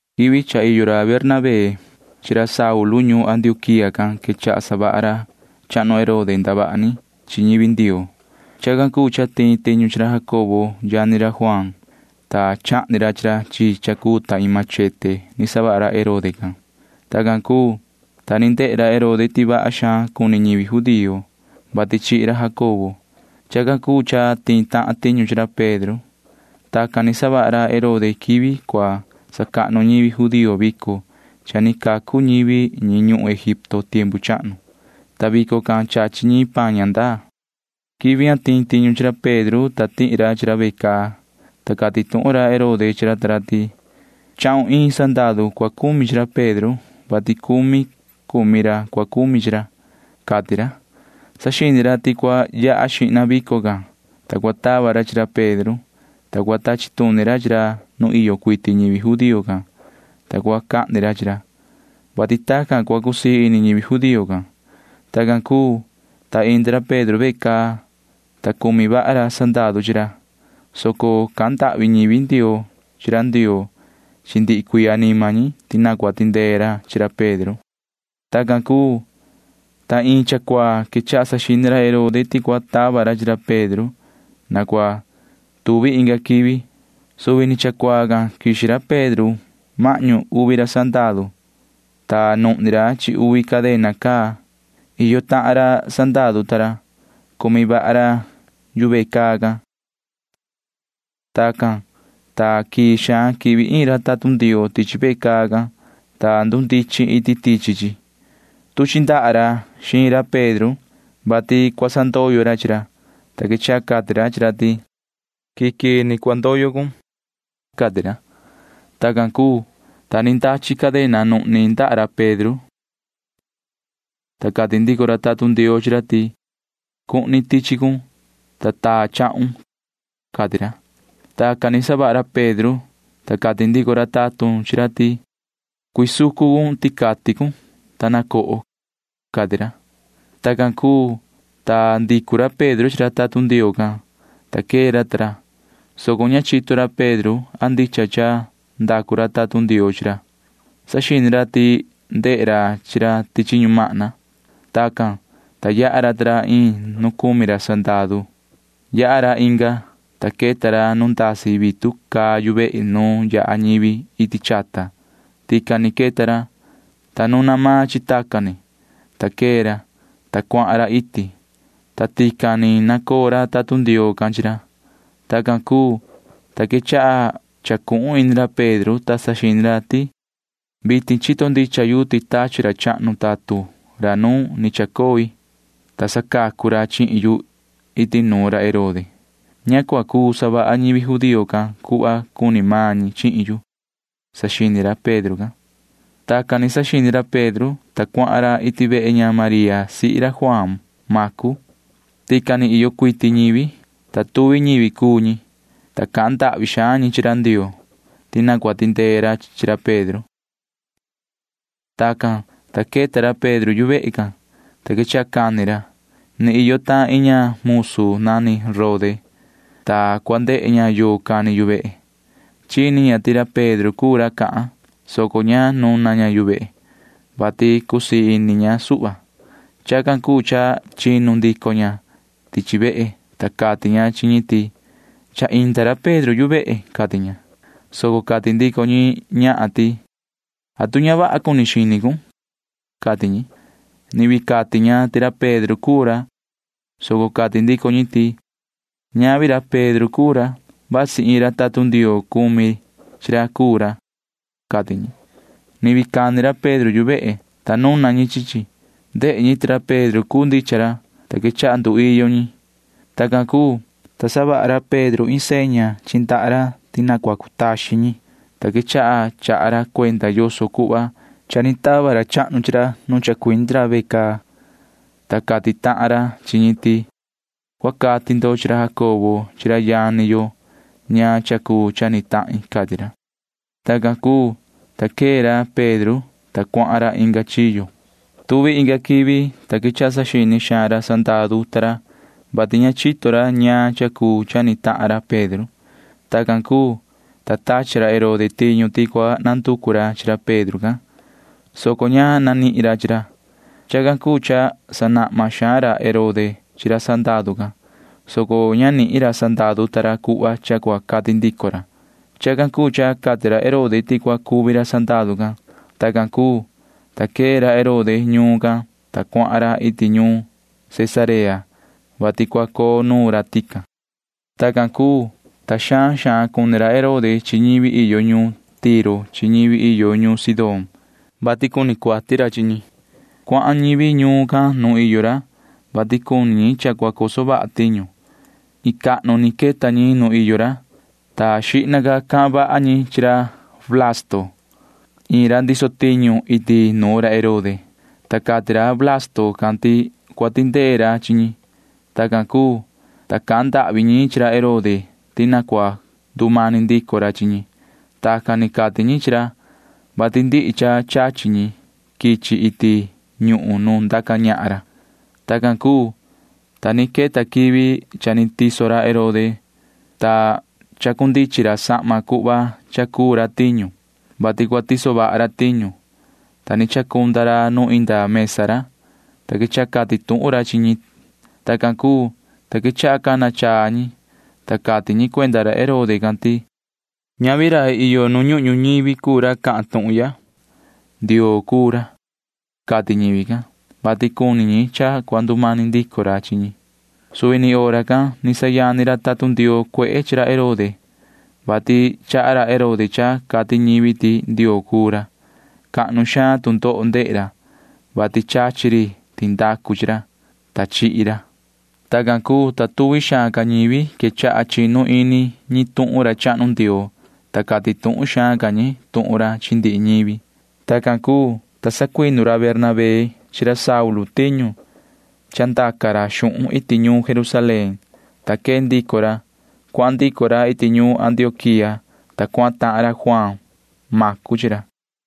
Quivi cha iyo ra Bernabé chi ra Saulu ñuun Antioquía can quechaha savaha ra chahnu Herode ndavaha ni chi ñivi Ndioo. Chacan cuu cha tiin tiñu chi ra Jacobo yani ra Juaan, ta chahni ra chi ra chi cha cuu ta iin machete ni savaha ra Herode can. Tacan cuu, ta ni ndehe ra Herode ti vaha xaan cuni ñivi judío, vati chihi ra Jacobo. Chacan cuu cha tiin tahan tiñu chi ra Pedro. Tacan ni savaha ra Herode quivi cua sacahnu ñivi judío vico cha ni cacu ñivi ñi ñuhun Egipto tiempu chahnu, ta vico can chachi ñi paan ña ndaa. Quivi tiin tiñu chi ra Pedro tihi ra chi ra ve caa, ta cati tuhun ra Herode chi ra ta ra ti: ―Chahun iin sandaru cua cumi chi ra Pedro, vati cumi cumi ra cua cumi chi ra, cati ra. Saxini ra ti cua yaha xihna vico can, ta cua tava ra chi ra Pedro, ta cua tachi tuni ra chi ra nu iyo cuiti ñivi judío can, ta cua cahni ra chi ra, vati tacan cua cusii ini ñivi judío can. Tacan cuu, ta indi ra Pedro ve caa, ta cumi vaha ra sandaru chi ra, soco cahan ndahvi ñivi Ndioo chi ra Ndioo chi ndihi cuii anima ñi ti na cua tindee ra chi ra Pedro. Tacan cuu, ta iin cha cuaa quechaha saxini ra Herode ti cua tava ra chi ra Pedro na cua tuvi inga quivi. Suvi ni cha cuaa can quixi ra Pedro mahñu uvi ra sandaru, ta nuhni ra chi uvi cadena caa. Iyo tahan ra sandaru ta ra―cumi vaha ra yu ve caa can. Tacan, ta quii xaan quihvi iin ra tatun Ndioo tichi ve caa can, ta ndundichin iti tichi chi. Tuchi ndaha ra xiin ra Pedro, vati cua sandoyo ra chi ra, ta quechaha cati ra chi ra ti: ―Quii quii ni cua ndoyo cun ―cati ra. Tacan cuu, ta ni ndachi cadena nuhni ndaha ra Pedro, ta cati ndico ra tatun Ndioo chi ra ti: ―Cuhni tichi cun, ta taa chahun ―cati ra. Tacan ni savaha ra Pedro, ta cati ndico ra tatun chi ra ti: ―Cuisucu cun ticati cun, ta na coho ―cati ra. Tacan cuu, ta ndicu ra Pedro chi ra tatun Ndioo can, ta quee ra ta ra, soco ña chito ra Pedro a ndicha cha ndacu ra tatun Ndioo chi ra. Saxini ra ti ndehe ra chi ra tichi ñumahna. Tacan, ta yaha ra ta ra iin nu cumi ra sandaru. Yaha ra inga, ta queta ra nu ndasi vitu caa yu vehe nu yaha ñivi iti chata. Tican ni queta ra, ta nuna maan chi tacan ni, ta quee ra, ta cuahan ra iti, ta tican ni nacoo ra tatun Ndioo can chi ra. Tacan cuu, ta quechaha chacuhun ini ra Pedro, ta saxini ra ti: ―Vitin chito ndicha yu ti tachi ra chahnu tatun ra nu ni chacoi, ta sacacu ra chihin yu iti nuun ra Herode. Ña cua cuu savaha ñivi judío can cuhva cuni maan ñi chihin yu ―saxini ra Pedro can. Tacan ni saxini ra Pedro, ta cuahan ra iti vehe ña María sihi ra Juaan Macu. Tican ni iyo cuiti ñivi, ta tuvi ñivi cuu ñi, ta cahan ndahvi xaan ñi chi ra Ndioo ti na cua tindee ra chi ra Pedro. Tacan, ta queta ra Pedro yu vehe can, ta quechaha cani ra. Ni iyo tahan iin ña musu nani Rode, ta cua ndehe ña yoo cani yu vehe. Chini ña ti ra Pedro cuu ra cahan, soco ña nuna ña yu vehe, vati cusii ini ña suhva. Chacan cuu cha chinu ndico ña tichi vehe, ta cati ña chi ñi ti: ―Cha inda ra Pedro yu vehe ―cati ña. Soco cati ndico ñi chi ña ti: ―¿Atu ña vaha cuni xini cun? ―cati ñi. Ni vii cati ña ti ra Pedro cuu ra, soco cati ndico ñi ti: ―Ñavi ra Pedro cuu ra. Vasi iin ra tatun Ndioo cumi chi ra cuu ra ―cati ñi. Ni vii cani ra Pedro yu vehe, ta nuna ñi chi chi. Ndehe ñi ti ra Pedro cuu ndicha ra, ta quechaha nduiyo ñi. Tacan cuu, ta savaha ra Pedro iin seña chi ndaha ra ti na cua cutaxin ñi, ta quechaha chaha ra cuenda yoso cuhva cha ni tava ra chahnu chi ra nu chacuindi ra ve caa, ta cati tahan ra chi ñi ti: ―Cua cati ndo chi ra Jacobo chi ra yani yo ñaan cha cuu cha ni tahin ―cati ra. Tacan cuu, ta quee ra Pedro, ta cuahan ra inga chiyo. Tuvi inga quivi, ta quechaha saxini xaan ra sandaru ta ra, vati ña chito ra ñaan cha cuu cha ni tahan ra Pedro. Tacan cuu, ta tachi ra Herode tiñu ti cua nanducu ra chi ra Pedro can, soco ña nanihin ra chi ra. Chacan cuu cha sanahma xaan ra Herode chi ra sandaru can, soco ña nihin ra sandaru ta ra cuhva cha cua cati ndico ra. Chacan cuu cha cati ra Herode ti cua cuvi ra sandaru can. Tacan cuu, ta quee ra Herode ñuun can, ta cuahan ra iti ñuun Cesarea, vati cua coo nuun ra tican. Tacan cuu, ta xaan xaan cuni ra Herode chi ñivi iyo ñuun Tiro chi ñivi iyo ñuun Sidón, vati cuni ra cuati chi ñi. Cuahan ñivi ñuun can nuun iyo ra, vati cuni ñi cha cua coso vaha tiñu. Iin cahnu ni queta ñi nu iyo ra, ta xihna cahan vaha ñi chi ra Blasto iin ra ndiso tiñu iti nuun ra Herode, ta cati ra Blasto can ti cua tindee ra chi ñi. Tacan cuu, ta cahan ndahvi ñi chi ra Herode ti na cua ndumani ndico ra chi ñi. Tacan ni cati ñi chi ra, vati ndihi cha chachi ñi quichi iti ñuhun nu ndaca ñahan ra. Tacan cuu, ta ni queta quivi cha ni tiso ra Herode, ta chacundichin ra sahma cuhva cha cuu ra tiñu, vati cua tiso vaha ra tiñu, ta ni chacunda ra nu inda mesa ra, ta quechaha cati tuhun ra chi ñi. Tacan cuu, ta quechaha cana chaa ñi, ta cati ñi cuenda ra Herode can ti: ―Ñavi iin rai iyo nu ñuhun ñuñivi cuu ra cahan tuhun ya. Ndioo cuu ra ―cati ñivi can, [vati cuni ñi cha cua ndumani ndico ra chi ñi]. Suvi ni hora can ni sayani ra tatun Ndioo cuehe chi ra Herode, vati chaha ra Herode cha cati ñivi ti ndioo cuu ra. Cahnu xaan tu ndoho ndehe ra, vati chachi ri tindacu chi ra, ta chihi ra. Tacan cuu, ta tuvi xaan ca ñivi quechaha chinu ini ñi tuhun ra chahnu Ndioo, ta cati tuhun xaan ca ñi tuhun ra chi ndihi ñivi. Tacan cuu, ta sacuinu ra Bernabé chi ra Saulu tiñu cha ndaca ra xuhun iti ñuun Jerusalén, ta quee ndico ra. Cuahan ndico ra iti ñuun Antioquía, ta cuahan tahan ra Juaan Macu chi ra.